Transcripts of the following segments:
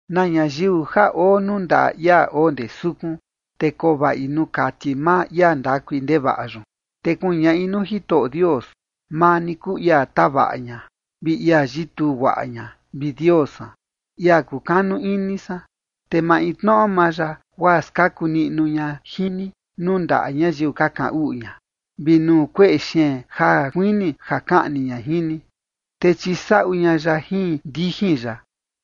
Na ñayiu ja oo nuu ndaꞌa ia oo ndee sukun, te koo vaꞌi nuu kati maa ia ndakui ndevaꞌa yun. Te kuñaꞌi nuu Jitoꞌo Dios: “Maa ni kuu ia tavaꞌa ña, vi ia yituu guaꞌa ña, vi Dios san, ia kukanu ini san”. Te maintnoꞌo maa ya, guaa skaku ña jin ni nuu ndaꞌa ñayiu ka kaꞌan uꞌu ña, vi nuu kueꞌe xeen ja kuini ja kaꞌni ña jin ni. Te chisaꞌu ña ya jin ndijin ya,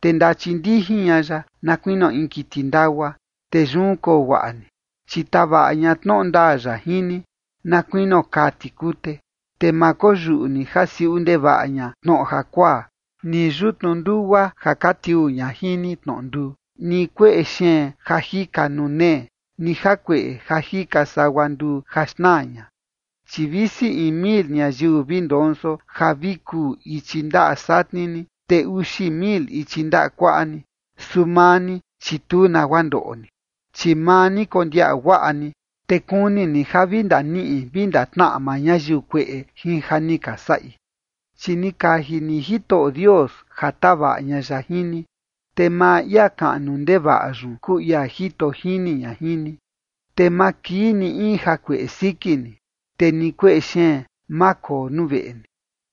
te ndachindijin ña ya, na kuinio in kiti ndagua, te yun koo guaꞌa ni, chi tavaꞌa ña tnoꞌo ndaa ya jin ni, na kuinio kaa tikute. Te ma koyuꞌu ni ja siuꞌu ndevaꞌa ña tnoꞌo jakuaa, ni yutnu ndugua ja ka tiuu ña jin ni tnoꞌo nduu, ni kueꞌe xeen ja jika nuu nee, ni jakueꞌe ja jika sagua nduu ja xnaa ña. Chi visi in mil ñayiu vi ndonso ja vi kuu ichi ndaꞌa satni ni, te uxi mil ichi ndaꞌa kuaꞌa ni, su maa ni, chi tu nagua ndoꞌo ni. Chi maa ni kondiaꞌa guaꞌa ni, te kuni ni ja vi ndaniꞌi vi ndatnaꞌa maa ñayiu kueꞌe jin ja ni ka saꞌi. Chi ni kaji ni Jitoꞌo Dios ja tavaꞌa ña ya jin ni, te maa ia kaꞌnu ndevaꞌa yun kuu ia jito jini ña jin ni. Te ma kii ni in jakueꞌe siki ni, te ni kueꞌe xeen, ma koo nuu veꞌe ni.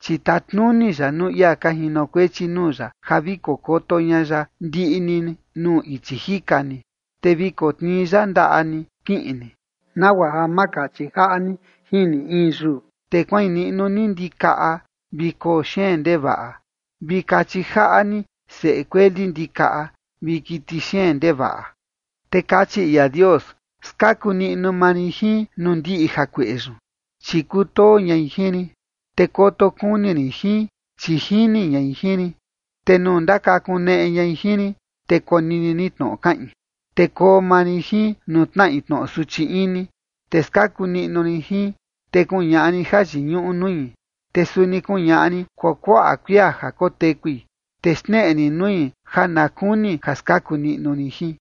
Chi tatnuni ya nuu ia ka jinokuechi nuu ya ja vi kokoto ña ya ndiꞌi ni nuu ichi jika ni. Te vi kotnii ya ndaꞌa ni kiꞌin ni nagua ja ma kachi jaꞌa ni jin ni in yuu. Te kuain niꞌnu ni ndikaꞌa vi koo xeen ndevaꞌa, vi kachi jaꞌa ni seꞌe kueli ndikaꞌa vi kiti xeen ndevaꞌa. Te kachi ia Dios: “Skaku niꞌnu maa rin jin nuu ndiꞌi jakueꞌe yun, chi kutoo ñai jin rin, te koto kuni rin jin, chi jini ñai jin rin. Te nuu ndakakuneꞌe ñai jin rin, te konini rin tnoꞌo kaꞌin, te koo maa rin jin nuu tnaꞌi tnoꞌo suchi ini, te skaku niꞌnu rin jin, te kuñaꞌa rin jayiñuꞌu nui. Te suni kuñaꞌa rin kuakuaꞌa kuia ja kotekui, te xneꞌe rin nui ja na kuni ja skaku niꞌnu rin jin.”